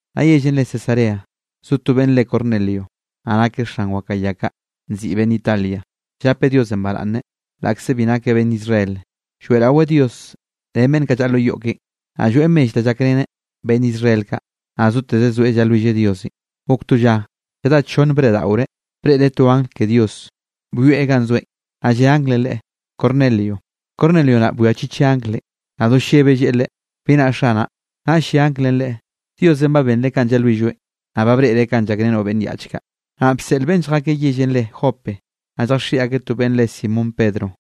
Naꞌ yellenꞌ re Cesarea, zo to beꞌnn re Cornelio, naꞌ nakeꞌ xan wakaꞌa ya kaꞌ, nziꞌi Beꞌnn Italia. Llapeꞌ Diosenꞌ baraꞌnne, laꞌkze bi nakeꞌ beꞌnn Israel, lloeꞌraweꞌ Dios ren beꞌnn kaꞌ llaꞌa lo yoꞌ keꞌen, naꞌ lloeꞌ mell da llakreneꞌ beꞌnn Israel kaꞌ, naꞌ zoteze zoeꞌ llalwilleꞌ Diosenꞌ. Gok to lla, lladá chonne breꞌdaꞌoreꞌ, breꞌreꞌ to angl ke Dios byoeꞌ ganꞌ zoeꞌn, naꞌ lle anglenꞌ leꞌe: —¡Cornelio! Cornelio naꞌ bwiachicheꞌ anglenꞌ, naꞌ do llebeꞌ lleꞌe leꞌe: —¿Bi naꞌ, xanaꞌ? Naꞌll lle anglenꞌ leꞌe: —Diosenꞌ ba benreꞌ kanꞌ llalwilloeꞌn, naꞌ ba breꞌreꞌ kanꞌ llakrenoꞌ beꞌnn yaꞌch kaꞌ. Naꞌ bseꞌl beꞌnn lljakeꞌ yellenꞌ re Jope, naꞌ lljaxiꞌi akeꞌ to beꞌnn re Simón Pedro.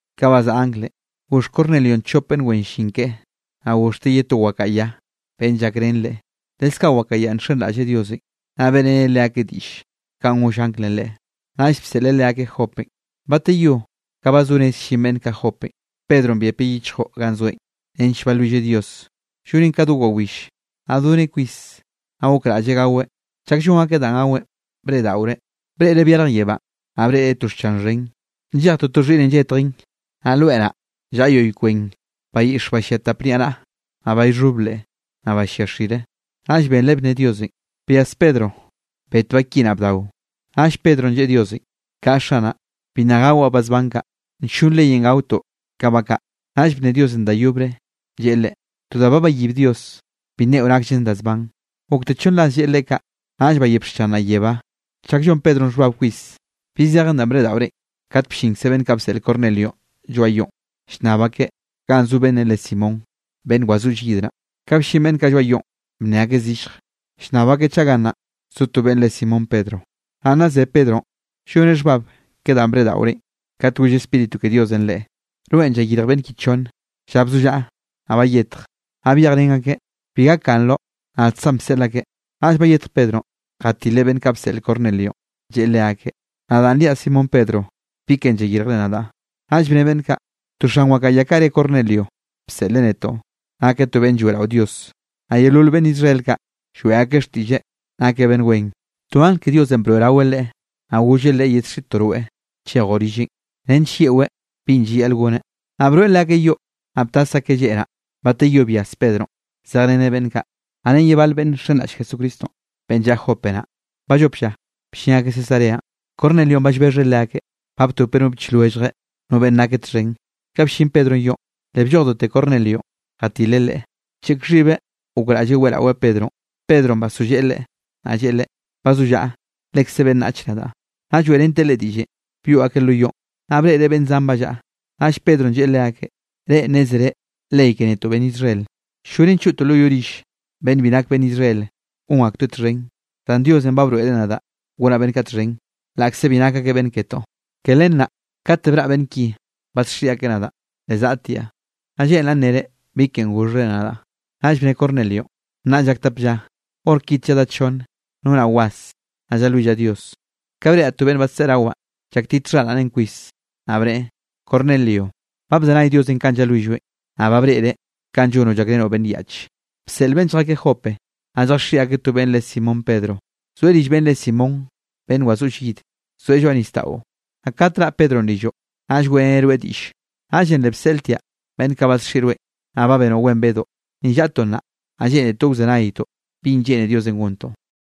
Ka bazaꞌa anglenꞌ, goxh Cornelionꞌ chop beꞌnn wen llin keꞌe, naꞌ goxhteꞌ ye to wakaꞌa ya, beꞌnn llakrén leꞌe, leskaꞌ wakaꞌa yanꞌ nxenraꞌlleꞌ Diosenꞌ. Naꞌ beꞌreneꞌ leakeꞌ diꞌll kanꞌ goll anglenꞌ leꞌe, naꞌll bseꞌleꞌ leakeꞌ Jopenꞌ. Bateyó ka ba zo rez llin beꞌnn kaꞌ Jopenꞌ, Pedronꞌ byepeꞌ yichjo ganꞌ zoeꞌn, nench balwilleꞌ Dios, llonen ka do wawill. Naꞌ doneꞌ kwis, naꞌ gokraꞌlleꞌ gaweꞌ. Chak llon akeꞌ da gaweꞌn, breꞌdaꞌoreꞌ. Breꞌreꞌ byarj yebánꞌ, naꞌ breꞌreꞌ to xchan xhen, nllej toto xhiꞌne lletjen. Naꞌ loe naꞌ llaꞌa yoꞌy kwen bayiꞌxe ba llia tap niaꞌnaꞌa, naꞌ ba llxhob leꞌ, naꞌ ba llia xire. Naꞌll benreꞌ bne Diosenꞌ: —Byas Pedro, bet ba ki naꞌ bdao. Naꞌll Pedronꞌ lleꞌe Diosenꞌ: —Kaꞌa, Xanaꞌ, bi nna gawaꞌ ba zban kaꞌ, nllon leyenꞌ gaotoꞌ ka ba kaꞌ. Naꞌll bne Diosenꞌ da yobre, lleꞌe leꞌe: —To da ba bayib Dios, bi nneꞌo nakllen da zban. Gokte chonn ras lleꞌe leꞌe kaꞌ, naꞌll bayep xchan naꞌ yebá. Chak llon Pedronꞌ xhbab kwis, bi zejen danꞌ breꞌdaꞌoreꞌn, kat bllinkze beꞌnn kaꞌ bseꞌl Cornelionꞌ lloaꞌ yoꞌn, llnnab akeꞌ ganꞌ zo beꞌnnenꞌ re Simón, beꞌnn wazoꞌll yid naꞌ. Ka bllin beꞌnn kaꞌ lloaꞌ yoꞌn, bnne akeꞌ zillje, llnnab akeꞌ chaꞌ gannaꞌn zo to beꞌnn re Simón Pedro. Naꞌ nna ze Pedronꞌ lloneꞌ xhbab ke danꞌ breꞌdaꞌoreꞌn, kat goll Spíritu ke Diosenꞌ leꞌe: —Rweꞌn llayirj beꞌnn ki chonne. Lla bzollaꞌa, naꞌ bayetj, naꞌ byejrén akeꞌ, bi gakganroꞌ, nadkzaꞌn bseꞌl akeꞌ. Naꞌll bayetj Pedronꞌ, jatileꞌ beꞌnn kaꞌ bseꞌl Cornelionꞌ, lleꞌe leakeꞌ: —Nadaꞌn riaꞌ Simón Pedro, ¿bi ken llayirjre nadaꞌ? Naꞌll bne beꞌnn kaꞌ: —To xan wakaꞌa ya kaꞌ re Cornelio bseꞌleꞌ netoꞌ, nakeꞌ to beꞌnn lloeꞌrao Dios, naꞌ yeolol beꞌnn Israel kaꞌ, lloeꞌ akeꞌ xtiꞌlleꞌ nakeꞌ beꞌnn wen. To angl ke Diosenꞌ broeꞌraweꞌ leꞌe, naꞌ golleꞌ leꞌe yedxiꞌtoꞌ rweꞌ chejoꞌ rilleꞌn, nench yeꞌweꞌ binꞌ llayaꞌl goneꞌ. Naꞌ broeꞌ leakeꞌ yoꞌ, naꞌ btas akeꞌ lleꞌ naꞌ. Bateyó byas Pedronꞌ zejreneꞌ beꞌnn kaꞌ, naꞌ ren ye bal beꞌnn nxenraꞌll Jesucristonꞌ, beꞌnn llaꞌa Jope naꞌ. Ballop lla bllin akeꞌ Cesareanꞌ. Cornelionꞌ ba llbexheꞌ leakeꞌ, ba btopeꞌ no biꞌch lwelljeꞌ, no beꞌnn nakeꞌ txhen. Ka bllin Pedronꞌ yoꞌn, le bllojdote Cornelionꞌ, jatileꞌ leꞌe, bcheꞌk xhibeꞌ gokraꞌlleꞌ weꞌraweꞌ Pedronꞌ. Pedronꞌ basolleꞌe leꞌe, naꞌ lleꞌe leꞌe: —Bazollaꞌa, lekze beꞌnnach nadaꞌ. Nna lloeꞌrenteꞌ leꞌe diꞌllenꞌ, byoꞌ akeꞌ lo yoꞌn, naꞌ breꞌreꞌ beꞌnn zan ba llaꞌa. Naꞌll Pedronꞌ lleꞌe leakeꞌ: —Reꞌ nnézere, ley ke netoꞌ beꞌnn Israel, ll-llonen choꞌtoꞌ lo yoꞌ rill beꞌnn bi nak beꞌnn Israel gon aktoeꞌ txhen, zan Diosenꞌ ba broeꞌreꞌ nadaꞌ gonaꞌ beꞌnn kaꞌ txhen, laꞌkze bi nak akeꞌ beꞌnn ketoꞌ. Ke len naꞌ, kate braꞌ beꞌnn ki badxiꞌi akeꞌ nadaꞌn, le zaꞌtiaꞌ. Naꞌ lleꞌnraꞌ nnere bi ken goxhre nadaꞌ. Naꞌll bne Cornelionꞌ: —Nnaꞌ llak tap lla, hor kite lladá chonne, nonaꞌ was, naꞌ llalwillaꞌ Dios, ka breꞌraꞌ to beꞌnn badseꞌe rawaꞌn llaktit xharaꞌneꞌn kwis. Naꞌ bneꞌe: “Cornelio, ba bzenay Diosenꞌ kanꞌ llalwilloeꞌn, naꞌ ba breꞌreꞌ kanꞌ llonoꞌ llakrenoꞌ beꞌnn yaꞌche. Bseꞌl beꞌnn lljakeꞌ Jope, naꞌ lljaxiꞌi akeꞌ to beꞌnn re Simón Pedro, zoeꞌ rill beꞌnn re Simón, beꞌnn wazoꞌll yid. Zoeꞌ lloaꞌ nisdaꞌo. Naꞌ kate raꞌ Pedronꞌ rilloꞌ, naꞌll weꞌreneꞌ rweꞌ diꞌlle.” Naꞌllenꞌ le bseꞌltiaꞌ beꞌnn kaꞌ badxiꞌi rweꞌn, naꞌ ba benoꞌ wen bedoꞌ. Ni llaꞌtoꞌ nnaꞌ, naꞌ lleꞌnetoꞌ wzenaytoꞌ binꞌ lleꞌne Diosenꞌ gontoꞌ.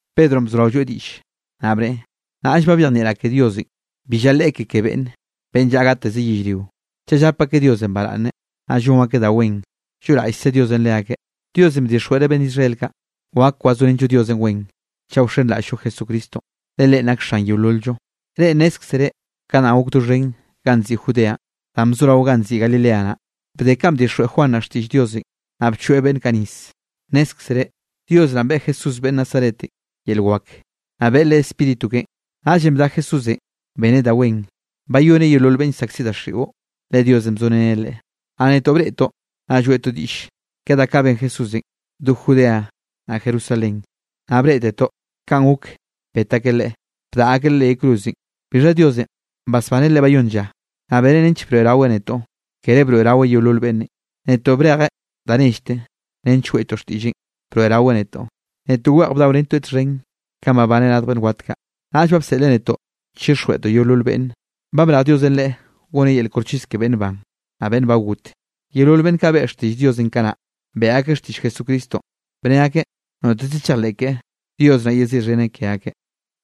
Pedronꞌ bzorao lloeꞌ diꞌll, naꞌ bneꞌe: —Nnaꞌll ba byejnieꞌraꞌ ke Diosenꞌ bi llaleꞌe ke ke beꞌnne. Beꞌnn llaꞌa gateze yellrio, chaꞌ llap akeꞌ Diosenꞌ baraꞌnne, naꞌ llon akeꞌ da wen, lloꞌraꞌllkze Diosenꞌ leakeꞌ. Diosenꞌ bdixjweꞌreꞌ beꞌnn Israel kaꞌ, wak wazorenllo Diosenꞌ wen, chaꞌ wxenraꞌll-llo Jesucristonꞌ, le Leꞌen nak Xan yeolol-llo. Reꞌ nnézkzere ka danꞌ gok doxhen ganꞌ nziꞌi Judeanꞌ, danꞌ bzorao ganꞌ nziꞌi Galilea naꞌ, bde kanꞌ bdixjweꞌ Juan naꞌ xtiꞌll Diosenꞌ, naꞌ bchoeꞌ beꞌnn kaꞌ nis. Nnézkzere, Dios naꞌn beꞌe Jesús beꞌnn Nazaretenꞌ yel wak, naꞌ beꞌe Leꞌe Spíritu keꞌen. Naꞌllenꞌ bda Jesúsenꞌ beneꞌ da wen, bayoneꞌ yeolol beꞌnn llsaꞌkziꞌ daxiꞌon, le Diosenꞌ bzorén Leꞌe. Naꞌ netoꞌ breꞌtoꞌ, naꞌ lloeꞌtoꞌ diꞌll ke da kaꞌ ben Jesúsenꞌ do Judea naꞌ Jerusalén, naꞌ breꞌtetoꞌ kanꞌ gok bet akeꞌ Leꞌe, bdaꞌa akeꞌ Leꞌe leꞌ yay cruzenꞌ. Bixha Diosenꞌ basbaneꞌ Leꞌe bayónn lla, naꞌ beneꞌ nench broeꞌraweꞌ netoꞌ. Kere broeꞌraweꞌ yeolol beꞌnnenꞌ, netoꞌ brejeꞌ da nellte nench weꞌtoꞌ xtiꞌlleꞌn broeꞌraweꞌ netoꞌ. Netoꞌ weꞌj bdaorentoeꞌ txhen, kanꞌ babaneꞌ radj beꞌnn wat kaꞌ. Naꞌll ba bseꞌleꞌ netoꞌ chixjweꞌtoꞌ yeolol beꞌnne, ba brej Diosenꞌ Leꞌe goneꞌ yel koxchis ke beꞌnn ban, naꞌ beꞌnn ba got. Yeolol beꞌnn kaꞌ beꞌe xtiꞌll Diosenꞌ kanaꞌ, beꞌe akeꞌ xtiꞌll Jesucristonꞌ, bne akeꞌ noteze chejleꞌ keꞌe, Dios naꞌ yeziꞌxheneꞌ ke akeꞌ.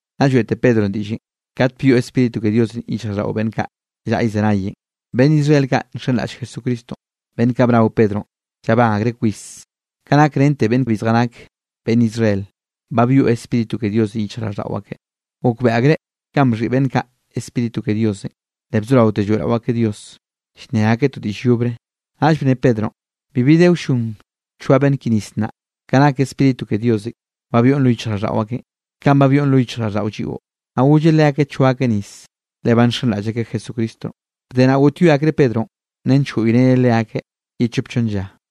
Nna lloeꞌte Pedronꞌ diꞌllenꞌ, kat byoꞌ Spíritu ke Diosenꞌ yichjraꞌlldaꞌo beꞌnn kaꞌ llaꞌa llzenayenꞌ. Beꞌnn Israel kaꞌ nxenraꞌll Jesucristonꞌ, beꞌnn kaꞌ bnao Pedronꞌ, llabán akreꞌ kwis ka nak rente beꞌnn bi zjanak beꞌnn Israel, ba byoꞌ Spíritu ke Diosenꞌ yichjraꞌlldaꞌo akeꞌ. Gokbeꞌe akreꞌ kanꞌ bxhiꞌi beꞌnn kaꞌ Spíritu ke Diosenꞌ, le bzoraote lloeꞌrao akeꞌ Dios, llnne akeꞌ to diꞌll yobre. Naꞌll bne Pedronꞌ: —Bibi de wllon choa beꞌnn ki nis nnaꞌ, ka nak Spíritu ke Diosenꞌ ba byoꞌn lo yichjraꞌlldaꞌo akeꞌn, kanꞌ ba byoꞌn lo yichjraꞌlldaꞌo lliꞌo. Naꞌ golleꞌ leakeꞌ choa akeꞌ nis, le ba nxenraꞌll akeꞌ Jesucristonꞌ. Bde naꞌ goꞌtyoe akreꞌ Pedronꞌ, nench goꞌyreneꞌ leakeꞌ ye chop chonn lla.